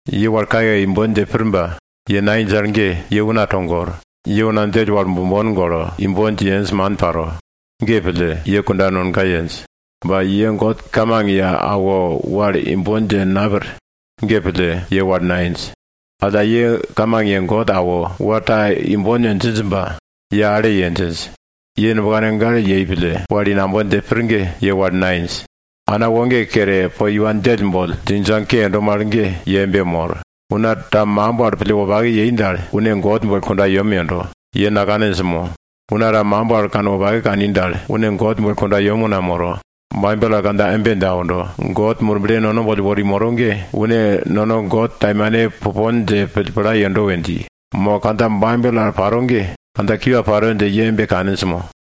Ye wal kayekaye imbon dje pir ba ye nainj al ge ye una togor. Ye una djell wal bombon golo, imbon dje yenj ge man paro. Ge pille, ye kunda nonga yenj. Ba ye God kamang ye awo wal imbon dje napir. Ge pille ye wal nainj. Alla ye kamang ye God awo wal ta imbon we djinj ba ye ale ye djinj. Ye nubkane gale yei pille wal i nambon dje pir ge, ye wal nainj. Ana woge kere po iwa djell boll djingdjang ke yendo mal ge, ye embe mor. Una ta makimb wal pille wopake yei dal, une God boll kundayem yendo. Ye nakaninj mo? Una ta makimb wal kanwopake kani dal, une God boll kundayem una moro. Baibel kandja embe dje aundo, God Murble nono boll wori moro ge, une nono God taimane pupon dje pille pla yendo we dji. Mo kandja Baibel al pai ge kandja kiwa paro dje ye embe kaninj mo?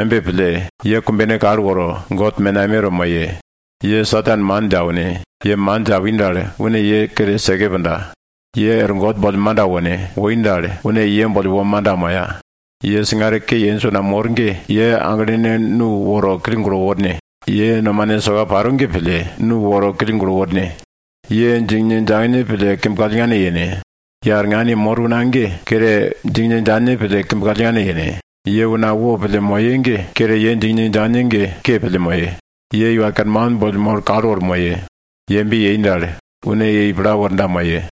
Embe pille, ye kumbene kal woro, God menameto moye. Ye Satan man dje aune. Ye man dje awi dal, une ye kere seke punda. Ye er God boll manda wone! Woi dal, une ye boll wo manda moya. Ye singare ke yenj una mor ge, ye aglene nu woro kill gulo worne. Ye nomane soka paro ge pille, nu woro kill gulo worne! Ye djingne djangne pille kimb kallngane yene! Ye arngan yemor una ge, kere djingne djangne pille kimb kallngane yene. Ye una wopille moye ge, ye kere ye djingne djangne ge pille ke pille moye. Ye Iwa Kerman boll molo kal woro moye. Ye embe yei dal, une ye i pla worda moye.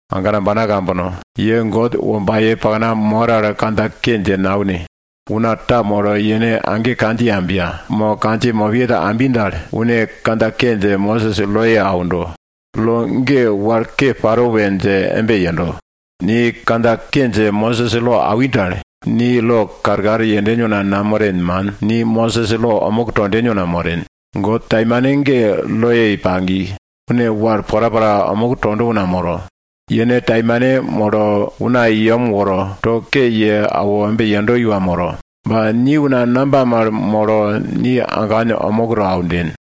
Agana ambana kambono, ye God wombaye pakna mor al kandja ke dje naune. Una ta molo yene age kandjiye ambiya, mo kandjiye mopiye ta ambi dal, une kandja ke dje Mosis loye aundo, lo ge wal ke paro dje pille embe yendo. Ni kandja ke dje Mosis lo awin dal, ni lo karkar yenden una namoren, man. Ni Mosis lo omuk tonden una moren. God taimane ge lo ye pagi. Une wal porapora omuk tonda una moro. Yene taimane molo una i yem woro, to ke ye awo embe yendo iwa moro. Ba ni una namba mal molo, ni agan omuk to aunden?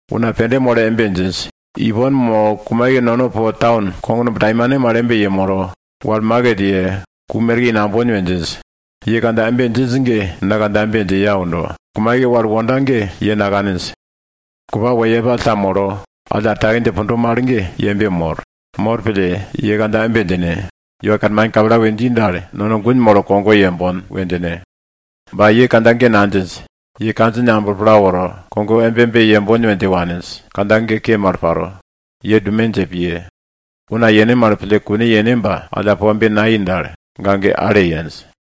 Una pende molo embe djinj, ipon mo kumaike nono po taun kognumb taimane mal ta yemolo, wal maket ye, ku merke i nambon we djinj. Ye kandja embe djinj ge, na kandja embe dje ye aundo. Kumaike wal wonda ge, ye nakaninj. Kupa wo yepall ta molo alla er take dje pundo mal ge ye embe mor. Mor pille, ye kandja embe djine, Iwa Kerman kapla we dji dal, nono gun molo kogo yembon we djine. Ba ye kandja ge nadjinj. Ye kandjine amblo pla woro, kogo embe embe yembon we dje waninj. Kandja ge ke mal paro. Ye dume dje piye! Una yene mal pille kune yene ba alla po embe nayei dal, ga ge ale yenj.